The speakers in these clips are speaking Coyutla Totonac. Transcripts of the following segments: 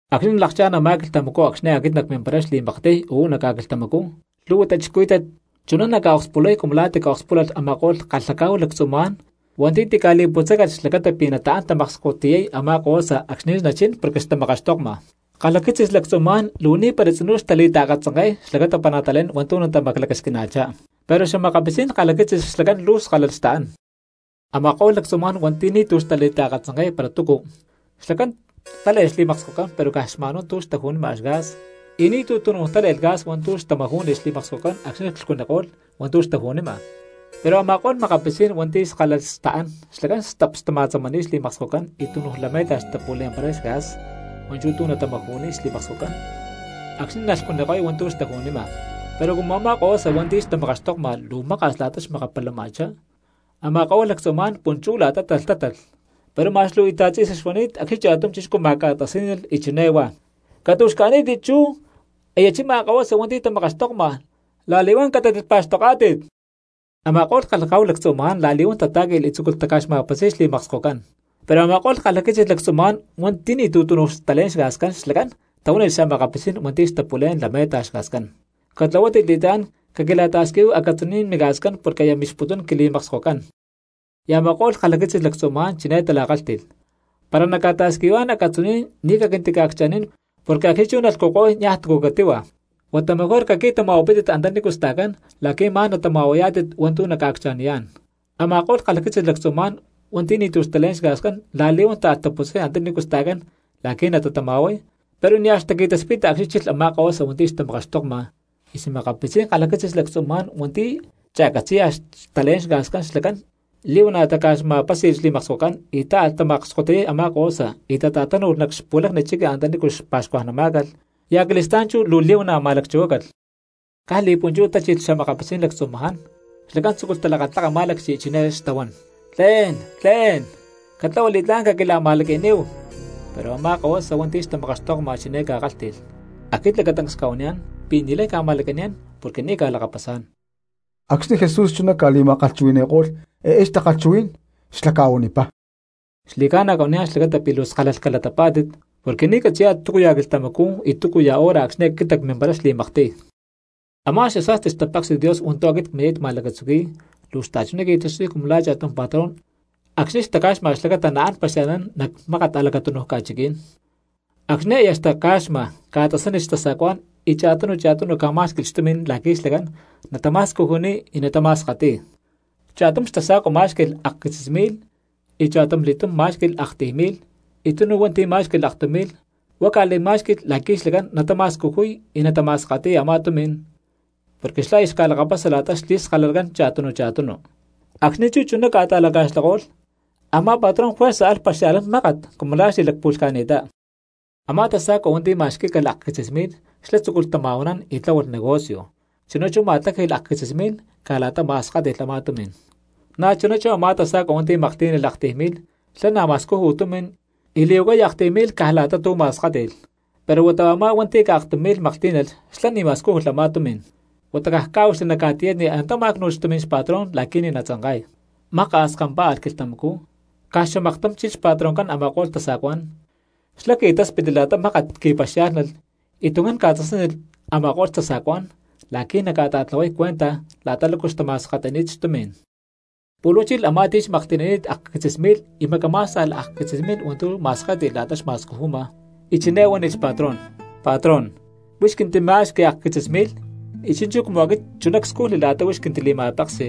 ’Acxni̠ nalakchá̠n a̠má quilhtamacú acxni̠ aquit nacmimparay xli̠maktiy uú nac ca̠quilhtamacú, lhu̠hua cristianos chuná naca̠akspulay cumu la̠ tica̠akspúlalh a̠ma̠ko̠lh kalhacá̠hu lactzumaján hua̠nti̠ tica̠li̠putzácalh xlacata pi̠ nataán tamakskotiyay a̠má kahuasa acxni̠ nachín porque xtamakaxtokma. Kalhaquitzis lactzumaján luu ni̠para tzinú xtali̠taakatzanke̠y xlacata para natalé̠n hua̠ntu̠ natamaclacasquina̠chá, pero xa̠makapitzí̠n kalhaquitzis xlacán luu skálalh xtaán. Ama̠ko̠lh lactzumaján hua̠nti̠ ni̠tu̠cu xtali̠taakatzanke̠y para túcu, xlacán tále̠lh xli̠makskocán pero caj xma̠nhuá tu̠ xtaju̠ma gas, y ni̠tu̠ túnuj tále̠lh gas hua̠ntu̠ xtamajú̠nilh xli̠makskocán acxni̠ clhcuniko̠lh hua̠ntu̠ xtaju̠nima. Pero a̠ma̠ko̠lh makapitzí̠n hua̠nti̠ skálalh xtaán xlacán stap tama̠tzámalh xli̠makskocán y túnuj lame̠ta xtapu̠le̠mparay gas hua̠nchú tu̠ natamaju̠niy xli̠makskocán acxni̠ nalhcuniko̠y hua̠ntu̠ xtaju̠nima. Pero cumu a̠má kahuasa hua̠nti̠ xtamakaxtokma luu maka̠s la̠ta xmakapalama̠chá, a̠ma̠ko̠lh lactzumaján punchú la̠ta talhtátalh. Pero ma̠x luu íta̠t tzi̠sa xuani̠t acxni̠ cha̠tum chixcú ma̠ca̠tasí̠nalh y chiné huá: “¡Catu̠xca̠ní̠tit chú aya chima kahuasa hua̠nti̠ tamakaxtokma, la̠li̠huán catátit pa̠xtoká̠tit!” Ama̠ko̠lh kalhacá̠hu lactzumaján la̠li̠huán tatá̠qui̠lh y tzúculh taca̠xma̠pasi̠y xli̠makskocán. Pero a̠ma̠ko̠lh kalhaquitzis lactzumaján hua̠nti̠ ni̠tu̠ túnuj xtalé̠n xgascán xlacán tahuánilh xa̠makapitzí̠n hua̠nti̠ xtapu̠lé̠n lame̠ta gas: “Catlahuátit li̠tlá̠n caquila̠ta̠squihuíhui acatzuní̠n migascán porque aya mixputún quili̠makskocán.” Y a̠ma̠ko̠lh kalhaquitzis lactzumaján chiné tala̠kálhti̠lh: “Para nacca̠ta̠squihuayá̠n acatzuní̠n ni̠ caquintica̠accha̠nín porque acxni̠ chú nalhcuniko̠y niaj túcu catíhua; huata mejor caqui̠tama̠huapítit antanícu sta̠cán la̠qui̠ ma̠n natama̠huayá̠tit hua̠ntu̠ naca̠accha̠niyá̠n.” Ama̠ko̠lh kalhaquitzis lactzumaján hua̠nti̠ ni̠tu̠ xtalé̠n gas la̠li̠huán táalh taputzay antanícu sta̠cán la̠qui̠ natatama̠huay, pero nia̠ xtaqui̠taspita acxni̠ chilh a̠má kahuasa hua̠nti̠ xtamakaxtokma; y xa̠makapitzí̠n kalhaquitzis lactzumaján hua̠nti̠ cha̠catzi̠ya xtalé̠n gas xlacán li̠huana̠ taca̠xma̠pási̠lh xli̠makskocán y táalh tamakskotiyay a̠má kahuasa y tata̠tánu̠lh nac xpu̠lacni chiqui antanícu xpa̠xcuajnamá̠calh, y acali̠stá̠n chú li̠huana̠ ma̠lacchuhuácalh. Caj li̠punchú tachilh xa̠makapitzí̠n lactzumaján, xlacán tzúculh talakatlaka má̠lacchi y chiné xtahuán: “Tle̠n, tlé̠n, catlahua li̠tlá̠n caquila̠ma̠laqui̠níhu.” Pero a̠má kahuasa hua̠nti̠ xtamakaxtokma chiné ca̠kálhti̠lh: “Aquit lacatancs cca̠huaniyá̠n pi̠ ni̠lay cca̠ma̠laqui̠niyá̠n porque ni̠ cca̠lakapasá̠n.” Acxni̠ Jesús chuná ca̠li̠ma̠kalhchuhui̠ni̠ko̠lh eé takalhchuhuí̠n xlá ca̠huanipá: —Xli̠ca̠na cca̠huaniyá̠n xlacata pi̠ luu skálalh calatapá̠tit, porque ni̠ catzi̠yá̠tit túcuya̠ quilhtamacú y túcuya̠ hora acxni̠ aquit nacmimparay xli̠maktiy. ’Amá xasa̠sti xtapéksi̠t Dios hua̠ntu̠ aquit cmini̠t ma̠lacatzuqui̠y luu xta̠chuná qui̠taxtuy cumu la̠ cha̠tum patrón acxni̠ xtaca̠xma xlacata naán paxia̠lhnán nac mákat a̠lacatúnuj ca̠chiquí̠n. Acxni̠ aya xtaca̠xma ca̠tasánilh xtasa̠cuá̠n y cha̠tunu cha̠tunu ca̠má̠xqui̠lh xtumi̠n la̠qui̠ xlacán natama̠scujuniy y natama̠skati̠y. Cha̠tum xtasa̠cua má̠xqui̠lh akquitzis mi̠lh, y cha̠tumli̠túm má̠xqui̠lh aktiy mi̠lh, y tunu hua̠nti̠ má̠xqui̠lh aktum mi̠lh; huá ca̠li̠má̠xqui̠lh la̠qui̠ xlacán natama̠scujuy y natama̠skati̠y a̠má tumi̠n, porque xlá aya xca̠lakapasa la̠ta xli̠skalalacán cha̠tunu cha̠tunu. Acxni̠ chú chuná ca̠ta̠laca̠xlako̠lh a̠má patrón juerza alh paxia̠lhnán mákat cumu la̠ xli̠lacpu̠lhca̠ni̠ttá. Amá tasa̠cua hua̠nti̠ ma̠xquí̠calh akquitzis mi̠lh xlá tzúculh tama̠huanán y tláhualh negocio, chuná chú ma̠tláji̠lh akquitzis mi̠lh caj la̠ta ma̠skáti̠lh a̠má tumi̠n. Na̠chuná a̠má tasa̠cua hua̠nti̠ maklhtí̠nalh aktiy mi̠lh xlá na̠ ma̠scúju tumi̠n y li̠huacay aktiy mi̠lh caj la̠ta tu̠ ma̠skáti̠lh. Pero huata a̠má hua̠nti̠ caj aktum mi̠lh maklhtí̠nalh xlá ni̠ ma̠scújulh a̠má tumi̠n, huata caj cá̠huaxli nac ca̠tiyatni y antá má̠cnu̠lh xtumi̠n xpatrón la̠qui̠ ni̠ natzanka̠y. ’Maka̠s kampá̠alh quilhtamacú, caj xamaktum chilh xpatroncán a̠ma̠ko̠lh tasa̠cuá̠n, xlá qui̠táspitli la̠ta mákat qui̠paxiá̠lhnalh y tuncán ca̠tasánilh a̠ma̠ko̠lh tasa̠cuá̠n la̠qui̠ naca̠ta̠tlahuay cuenta la̠ta lácu xtama̠skati̠ni̠t xtumi̠n. Pu̠lh huá chilh a̠má ti̠ xmaklhti̠nani̠t akquitzis mi̠lh y macamá̠sta̠lh akquitzis mi̠lh hua̠ntu̠ ma̠skáti̠lh la̠ta xma̠scujuma, y chiné huánilh xpatrón: “Patrón, huix quintima̠xqui akquitzis mi̠lh, y chi̠nchú cumu aquit chuná cscujli la̠ta huix quintili̠ma̠peksi,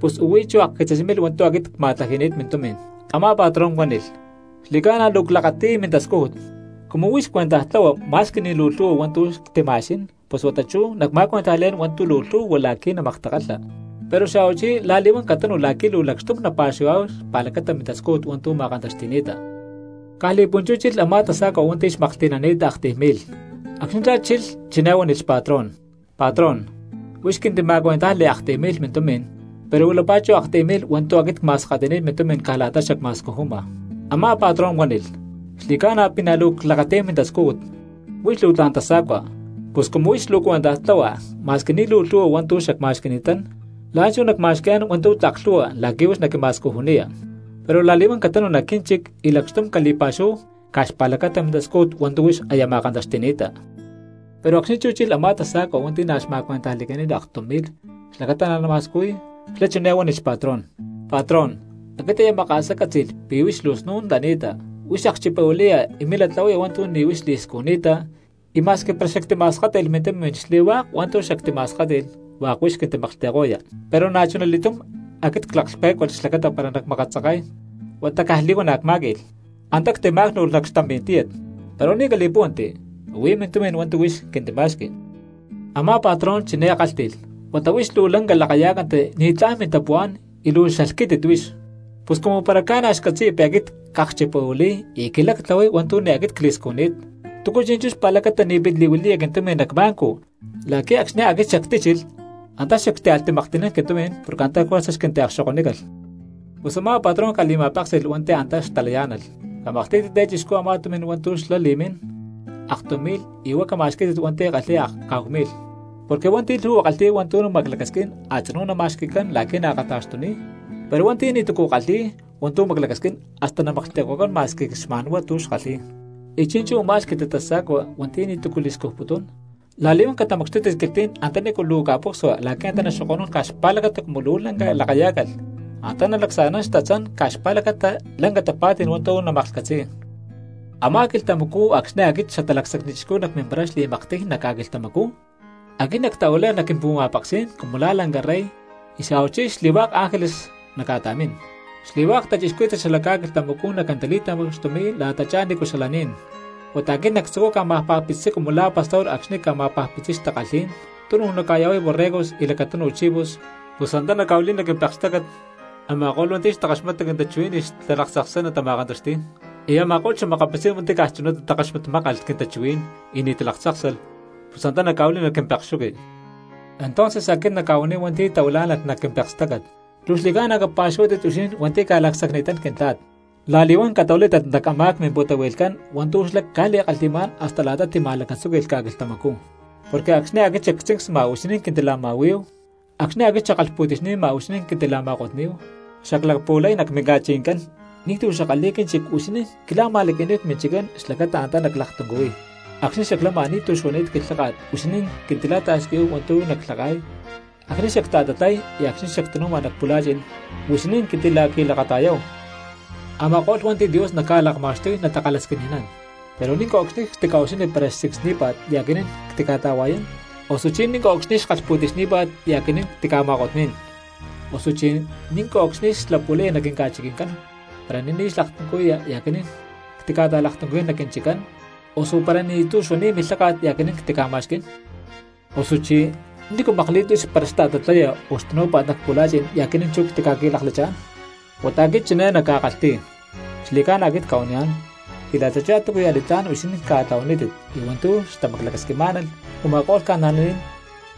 pus huí chú a̠akquitzis mi̠lh hua̠ntu̠ aquit cma̠tlaji̠ni̠t mintumi̠n.” Amá patrón huánilh: “Xli̠cána luu clakati̠y mintascújut. Cumu huix cuentaj tlahua ma̠squi ni̠ luu lhu̠hua hua̠ntu̠ ctima̠xquí̠n pus huata chú nacma̠cuentajli̠yá̠n hua̠ntu̠ tlak lhu̠hua la̠qui̠ namaktakalha. Pero xa̠huachí la̠li̠huán catanu la̠qui̠ luu lacxtum napa̠xuhuayá̠hu xpa̠lacata mintascújut hua̠ntu̠ ma̠kantaxti̠ni̠ta.” Caj li̠punchú chilh a̠má tasa̠cua hua̠nti̠ xmaklhti̠nani̠t aktiy mi̠lh. Acxni̠ xlá chilh chiné huánilh xpatrón: “Patrón, huix quintima̠cuentajli aktiy mi̠lh mintumi̠n, pero huilapá chú aktiy mi̠lh hua̠ntu̠ aquit cma̠skati̠ni̠t mintumi̠n caj la̠ta xacma̠scujuma.” Amá patrón huánilh: “Xli̠ca̠na pi̠ na̠ luu clakati̠y mintascújut, huix luu tla̠n tasa̠cua, pus cumu huix luu cuentaj tlahua ma̠squi ni̠ luu lhu̠hua hua̠ntu̠ xacma̠xqui̠ni̠tán la̠nchú nacma̠xqui̠yá̠n hua̠ntu̠ tlak lhu̠hua la̠qui̠ huix naquima̠scujuniya. Pero la̠li̠huán catanu nac quínchic y lacxtum cali̠pa̠xuhuahu caj xpa̠lacata mintascújut hua̠ntu̠ huix aya ma̠kantaxti̠ni̠ta.” ’Pero acxni̠ chú chilh a̠má tasa̠cua hua̠nti̠ xma̠cuentajli̠cani̠t aktum mi̠lh xlacata na̠ nama̠scujuy xlá chiné huánilh xpatrón: “Patrón, aquit aya maka̠sá ccátzi̠lh pi̠ luu snún lani̠ta huix akchipahuili̠ya y milá tlahuaya hua̠ntu̠ ni̠ huix li̠scujni̠ta y ma̠squi para xactima̠scújulh mintumi̠n xli̠hua̠k hua̠ntu̠ xactima̠skáti̠lh hua̠k huix xquintimaklhti̠ko̠ya. Pero na̠chuna li̠túm aquit claklhpé̠cualh xlacata para nacmakatzanka̠y huata caj li̠huana̠ cmá̠qui̠lh, antá ctimá̠cnu̠lh nac xtampí̠n tíyat. Pero ni̠ cali̠púhuanti, huí mintumi̠n hua̠ntu̠ huix quintima̠xqui.” Amá patrón chiné kálhti̠lh: “Huata huix luu lanca lakayá̠canti ni̠tlá̠n mintapuhuá̠n y luu xalhquítit huix. Pus cumu para ca̠na̠ xcatzi̠ya pi̠ aquit cakchipahuili̠y y quilá ctlahuay hua̠ntu̠ ni̠ aquit cli̠scujni̠t, ¿túcu chi̠nchú xpa̠lacata ni̠ pit li̠huili̠ya quintumi̠n nac banco la̠qui̠ acxni̠ aquit xactíchilh antá xactíalh timaklhti̠nán quintumi̠n porque antá juerza xquintiakxokonícalh?” Pus a̠má patrón ca̠li̠ma̠péksi̠lh hua̠nti̠ antá xtalayá̠nalh: “Camaklhtí̠tit eé chixcú a̠má tumi̠n hua̠ntu̠ xlá li̠mín aktum mi̠lh y huá cama̠xquí̠tit hua̠nti̠ kalhi̠y akcá̠hu mi̠lh. Porque hua̠nti̠ lhu̠hua kalhi̠y hua̠ntu̠ maclacasquín a̠tzinú nama̠xqui̠cán la̠qui̠ naakata̠xtuniy, pero hua̠nti̠ ni̠tu̠cu kalhi̠y hua̠ntu̠ maclacasquín hasta namaklhti̠ko̠cán ma̠squi caj xma̠nhuá tu̠ xkalhi̠y. Y chi̠nchú u̠má lhquítit tasa̠cua hua̠nti̠ ni̠tu̠cu li̠scujputún, la̠li̠huán catamacxtútit cquilhtí̠n antanícu luu ca̠pucsua la̠qui̠ antá naxoko̠nún caj xpa̠lacata cumu luu lanca lakayá̠calh, antá nalacsa̠nán xtatzán caj xpa̠lacata lanca tapa̠tí̠n hua̠ntu̠ namaklhcatzi̠y.” ’Amá quilhtamacú acxni̠ aquit Xatalacsacni Chixcú nacmimparay xli̠maktiy nac ca̠quilhtamacú, aquit nactahuilay nac quimpu̠ma̠peksí̠n cumu la̠ lanca rey y xa̠huachí xli̠hua̠k ángeles nacca̠ta̠mín. Xli̠hua̠k cristianos xala ca̠quilhtamacú naquintali̠tamacxtumi̠y la̠tachá nícu xalaní̠n; huata aquit nactzucuy ca̠ma̠pajpitziy cumu la̠ pastor acxni̠ ca̠ma̠pajpitziy xtakalhí̠n, tunuj ca̠ya̠huay borregos y lacatunu chivos samá̠nalh xlacata natama̠kantaxti̠y, pus antá nacca̠huili̠y nac quimpek. Ama̠ko̠lh cristianos hua̠nti̠ xtakaxmata quintachuhuí̠n y xtalaktzakstácat, y a̠ma̠ko̠lh xa̠makapitzí̠n hua̠nti̠ caj chunatá takaxmatmákan quintachuhuí̠n y ni̠ talaktzáksalh, pus antá nacca̠huili̠y nac quimpekxuqui. Entonces aquit nacca̠huaniy hua̠nti̠ tahuilá̠nalh nahuán nac quimpekstácat: “¡Luu xli̠ca̠na capa̠xuhuátit huixinín hua̠nti̠ ca̠lacsacni̠tán Quintla̠t! La̠li̠huán catahuilátit nac a̠má mimpu̠tahui̠lhcán hua̠ntu̠ xlá ca̠li̠kalhi̠má̠n hasta la̠ta tima̠lacatzúqui̠lh ca̠quilhtamacú. Porque acxni̠ aquit xactzincsni̠ma huixinín quintila̠ma̠huí̠hu, acxni̠ aquit xackalhpu̠ti̠xni̠ma huixinín quintila̠ma̠kotní̠hu, xaclapu̠lay nac minca̠chiqui̠ncán ni̠tu̠ xackalhi̠y quínchic huixinín quila̠ma̠laqui̠níhu cminchiccán xlacata antá naclaktuncuhui̠y. Acxni̠ xaclama ni̠tu̠ xuani̠t quilháka̠t huixinín quintila̠ta̠squihu hua̠ntu̠ naclhaka̠y, acxni xacta̠tatlay y acxni̠ xactanúma nac pu̠la̠chi̠n huixinín quintila̠qui̠lakata̠yáhu.” Ama̠ko̠lh hua̠nti̠ Dios naca̠lakma̠xtuy natakalhasquini̠nán: “Pero ¿ní̠nco̠cxni ctica̠ucxilhni para xtzincsní̠pa̠t y aquinín ctica̠ta̠hua̠yán? Osuchí ¿ní̠nco̠cxni xkalhpu̠ti̠xní̠pa̠t y aquinín ctica̠ma̠kotní̠n? Osuchi ¿ní̠nco̠cxni xlapu̠laya nac quinca̠chiqui̠ncán para ni̠ní xlaktuncuhuíya y aquinín ctica̠ta̠laktuncuhuí̠n nac quinchiccán, osu para ni̠tu̠ xuani̠t milháka̠t y aquinín ctica̠ma̠xquí̠n? Osuchí ¿nícu makli̠t para xta̠tatlaya o xtanú̠pa̠t nac pu̠la̠chi̠n y aquinín chú ctica̠qui̠laklachá̠n?” Huata aquit chiné nacca̠kalhti̠y: “Xli̠ca̠na aquit cca̠huaniyá̠n pi̠ la̠tachá túcuya̠ li̠tlá̠n huixinín ca̠tlahuanítit y hua̠ntu̠ xtamaclacasquixni̠má̠nalh u̠ma̠ko̠lh cristianos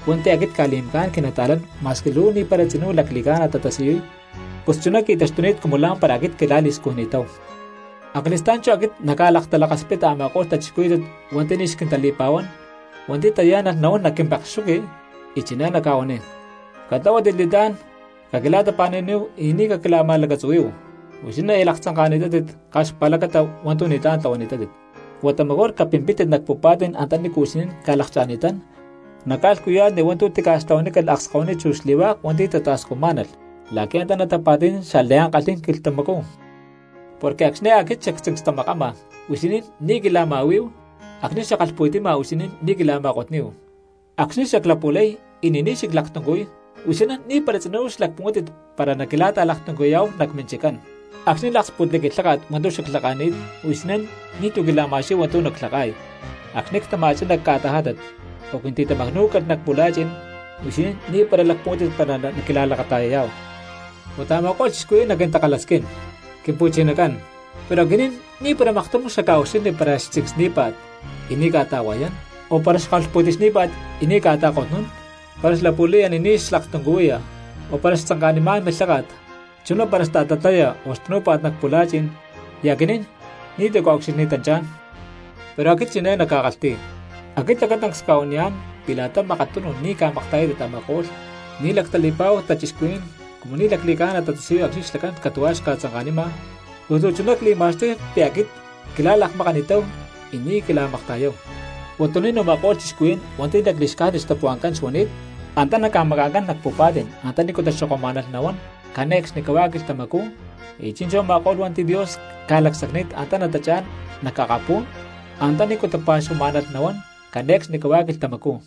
hua̠nti̠ aquit cca̠li̠macá̠n quinata̠lán ma̠squi luu ni̠para tzinú lacli̠ca̠na tatasiyuy, pus chuná qui̠taxtuni̠t cumu la̠mpara aquit quila̠li̠scujni̠táhu.” ’Acali̠stá̠n chú aquit nacca̠laktalakaspita a̠ma̠ko̠lh cristianos hua̠nti̠ ni̠ xquintali̠pa̠huán hua̠nti̠ tayá̠nalh nahuán nac quimpekxuqui y chiné nacca̠huaniy: “Catlahuátit li̠tlá̠n, caquila̠tapa̠nu̠níhu y ni̠ caquila̠ma̠lacatzuhuí̠hu. Huixinín aya laktzanka̠ni̠tátit caj xpa̠lacata hua̠ntu̠ ni̠tlá̠n tlahuani̠tátit. Huata mejor capimpítit nac pu̠pa̠tí̠n antanícu huixinín ca̠lakcha̠ni̠tán nac ca̠lhcuya̠tni hua̠ntu̠ tica̠xtlahuanícalh akskahuiní chu xli̠hua̠k hua̠nti̠ xtata̠scujmá̠nalh la̠qui̠ antá natapa̠ti̠nán xliankalhí̠n quilhtamacú. Porque acxni̠ aquit xactzincstamakama, huixinín ni̠ quila̠ma̠huí̠hu, acxni̠ xackalhpu̠ti̠xni̠ma huixinín ni̠ quila̠ma̠kotní̠hu. Acxni̠ xaclapu̠lay y ni̠ní xaclaktuncuhuíy huixinín ni̠para tzinú xlacpuhuántit para naquila̠ta̠laktuncuhui̠yá̠hu nac minchiccán. Acxni̠ laksputko̠lh quilháka̠t hua̠ntu̠ xaclhaka̠ni̠t huixinín ni̠tu̠ quila̠ma̠xquí̠hu hua̠ntu̠ naclhaka̠y; acxni̠ ctama̠chá nac ca̠tajátat o quintitamacnú̠calh nac pu̠la̠chi̠n huixinín ni̠para xlacpuhuántit para naquila̠lakata̠yayá̠hu.” Huata a̠ma̠ko̠lh cristianos naquintakalhasquín: “Quimpu̠chinacán, pero aquinín ni̠para maktum xacca̠ucxilhni para xtzincsní̠pa̠t y ni̠ cca̠ta̠hua̠yán, o para xkalhpu̠ti̠xní̠pa̠t y ni̠ cca̠ta̠hua̠yán, para xlapu̠laya ni̠ní xlaktuncuhuiya, o para xtzanka̠niyá̠n milháka̠t, chuná para xta̠tatlaya o xtanú̠pa̠t nac pu̠la̠chi̠n y aquinín ni̠tu̠ cca̠ucxilhni̠tanchá̠n.” Pero aquit chiné nacca̠kalhti̠y: “Aquit lacatancs cca̠huaniyá̠n pi̠ la̠ta makatunu ni̠ ca̠makta̠yátit a̠ma̠ko̠lh ni̠ lactali̠pa̠hu cristianos cumu ni̠ lacli̠ca̠na tatasiyuy acxni̠ xlacán catu̠huá xca̠tzanka̠nima, pus luu chuná cli̠ma̠xtuy pi̠ aquit quila̠lakmakani̠táhu y ni̠ quila̠makta̠yáhu.” Huatuní̠n u̠ma̠ko̠lh cristianos hua̠nti̠ lacli̠xcájnit xtapuhua̠ncán xuani̠t, antá naca̠maca̠ncán nac pu̠pa̠ti̠n antanícu taxoko̠numá̠nalh nahuán cane̠cxnicahuá quilhtamacú; y chi̠nchú a̠ma̠ko̠lh hua̠nti̠ Dios ca̠lacsacni̠t antá natachá̠n nac akapú̠n antanícu tapa̠xuhuamá̠nalh nahuán cane̠cxnicahuá quilhtamacú.